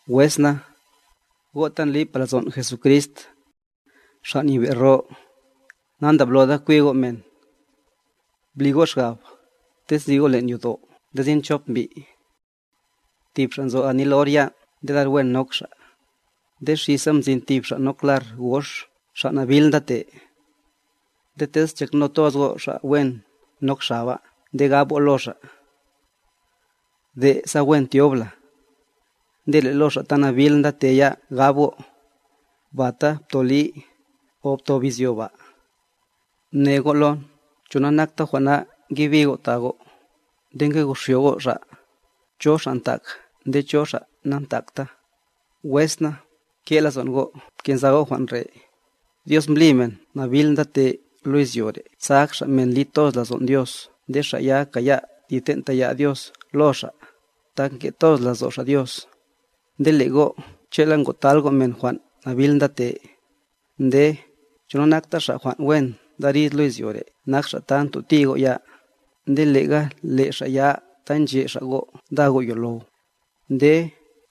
Wes na, go' ta ndlipa lazon' Jesucrist, Xa' Nyebe' ro, nandabloda kwi go' men. Bli go' xgab, tez nzi go' len' yodo' nde sin chop mbi': Tib xa' nzo anil or yan' nde lar wen nok xa', nde xisa mzin tib xa' nok lar gox xa' nabil ndate, nde tez nchakno toz go' xa' wen nok xaba nde gab go' lo xa': “De' sa wen tyob la,” nde le' lo xa' ta nabil ndate ya gab go': “Bata ptoli, o ptob izyo ba.” Mne go' lon, ¿cho nanakta jwan' na ngebi go' ta go', nde ngoxyo go' xa', cho xa' ntak nde cho xa' nantakta? Wes na, nke' lazo'n go', bke'nza go' jwan' re': Dios mbli men nabil ndate lo izyo re' sa ak xa' men li toz lazon' Dios nde xa' ya kaya' ti ten' taya' Dios lo xa', tak nke' lazo' xa' Dios. Nde le' go' che'la ngotal go' men jwan' nabil ndate. Nde, ¿Cho nanakta xa' jwan' wen ndarid lo izyo re' nak xa' ta ntoti go' ya, nde lega le' xa' ya ta nche' xa' go' nda go' yolow? Nde,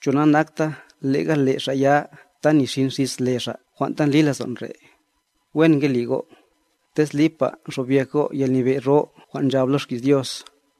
¿Cho nanakta lega le' xa' ya ta nixin xis le Xa' jwan' ta ndli lazon' re'? Wen nge li go', tez lipa xobyek go' yalnyebe' ro jwan' nchab lo xki's Dios: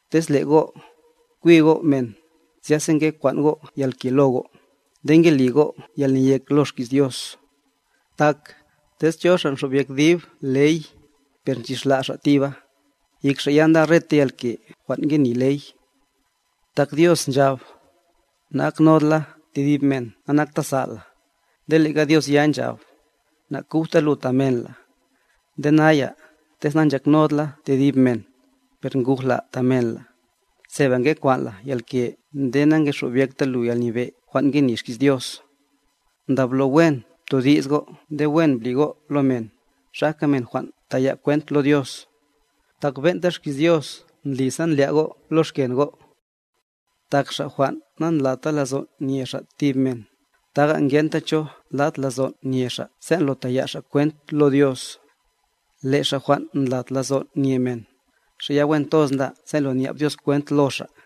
Tez le' go', nkwi go' men, zyasa nge kwan' go' yalke lo go', nde nge li go' yalneyek lo xki's Dios. Tak, tez cho xa' nxobyek dib ley, per nchixla' xa' tiba, yek xa' ya nda reta yalke jwan' ngeni ley. Tak Dios nchab: “Nagaknod la tedib men nanakta sal' la”, nde lega Dios ya nchab: “Nakujta lu ta men la”. Nde naya, tez nanchaknod la tedib men, per nguj la ta men la, seba nge kwan' la yalke nde nangexobyekta lu yalnyebe' jwan' ngeni xki's Dios. Ndablo wen btodi's go' nde wen bli go' lo men, xajka men jwan' taya' kwent lo Dios, tak ben'ta xki's Dios ndli sa ndlya' go' lo xken go'. Tak xa' jwan' nandlata lazon' nye xa' tib men, taga ngenta cho lat lazon' nye xa' sen' lo taya' xa' kwent lo Dios, le' xa' jwan' ndlat lazon' nye men, xa' ya wen toz nda sen' lo nya'b Dios kwent lo xa'.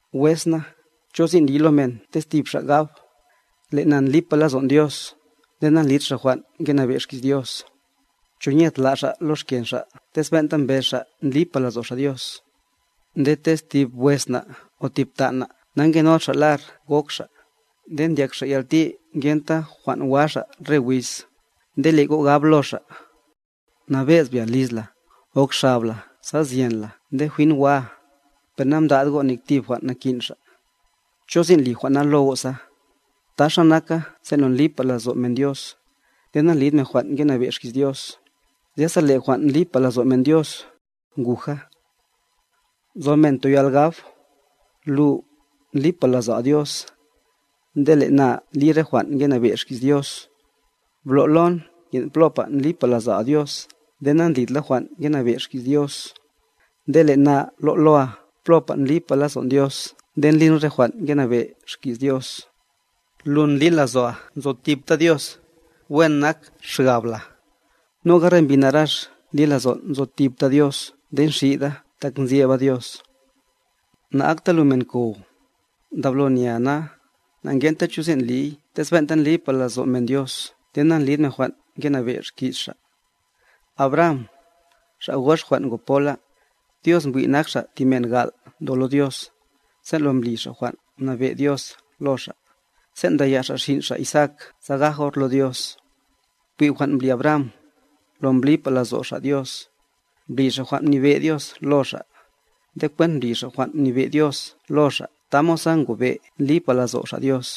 Wes na, ¿cho sin' liy lo men tez tib xa' gab: “Le' na ndlipa lazo'n Dios”, nde nandlid xa' jwan' ngenabe' xki's Dios? ¿Cho nye tla' xa' lo xken xa' tez ben'ta mbez xa' ndlipa lazo' xa' Dios? Nde tez tib wes na' o tib tan' na' nangenod xa' lar gok xa', nde ndyak xa' yalti ngenta jwan' wa xa' re wiz, nde le' go' gab lo xa': “Nabe'z bya liz la, gok xab la sa zyen la nde jwin waa”, per namda'd go' nek tib jwan' nakin' xa'. ¿Cho sin' li jwan' na lo go' sa? Taxa naka sen' lo ndlipa lazo' men Dios, nde nandlid men jwan' ngenabe' xki's Dios, zyasa le' jwan' ndlipa lazo' men Dios, nguja. Nzo men toyal gab: “Lu, ndlipa lazo'a Dios, nde le' na ndli re jwan' ngenabe' xki's Dios.” Blo' lon nyen' plopa ndlipa lazo'a Dios nde na'lid la jwan' ngenabe' xki's Dios, nde le' na lo' loa plopa ndlipa lazo'n Dios nde ndlin re jwan' ngenabe' xki's Dios. Lu ndli lazo'a nzo tipta Dios; wen nak xgab la. Noga re mbi narax ndli lazon' nzo tipta Dios nde nxida tak nzyeba Dios. ¡Na'akta lu men kow! Ndablo nyea na, na'ngenta cho sin' liy tez ben'ta ndlipa lazo' men Dios nde nalid men jwan' ngenabe' xki's Xa'. Abraham, xa' gox jwan' ngo pola, Dios mbwi' nak xa' ti men gal' ndo lo Dios, sen' lo mbli xa' jwan' mnabe' Dios lo xa', sen' mdaya' xa' xin' xa' Isaak sa gaj or lo Dios. Bwi' jwan' mbli Abraham, lo mblipa lazo' xa' Dios, mbli xa' jwan' mnibe' Dios lo xa', nde kwent mbli xa' jwan' mnibe' Dios lo xa' tamod sa ngobe' ndlipa lazo' xa' Dios.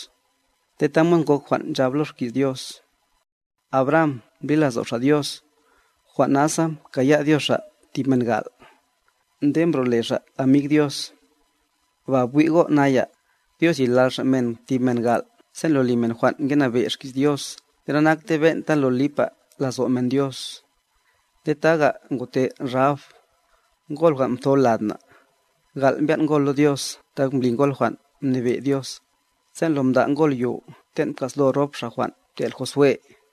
Nde tamod ngok jwan' nchab lo xki's Dios: “Abraham mbli lazo' xa' Dios, jwan' nasa mkaya' Dios xa' tib men gal'.”b Nde mbro'le xa' amig Dios. Ba bwi' go' naya, Dios lilal Xa' men tib men gal' sen' lo li men jwan' ngenabe' xki's Dios nde nanaktey ben'ta lo lipa lazo' men Dios. Nde taga ngote Rahab, ngol jwan' mtho lad na'; gal' mbyan' ngol lo Dios tak mbli ngol jwan' mnibe' Dios, sen' lo mda' ngol yo ten' mka'slo rop xa' jwan' mtel' Josué,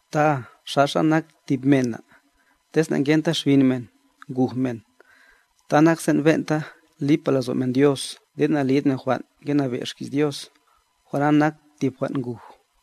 Ta xaxa nak tib mena, tez nangenta xbin men, nguj men, ta nak sen' ben'ta lipa lazo' men Dios nde nalid men jwan' ngenabe' xki's Dios, jwan' na nak tib jwan' nguj.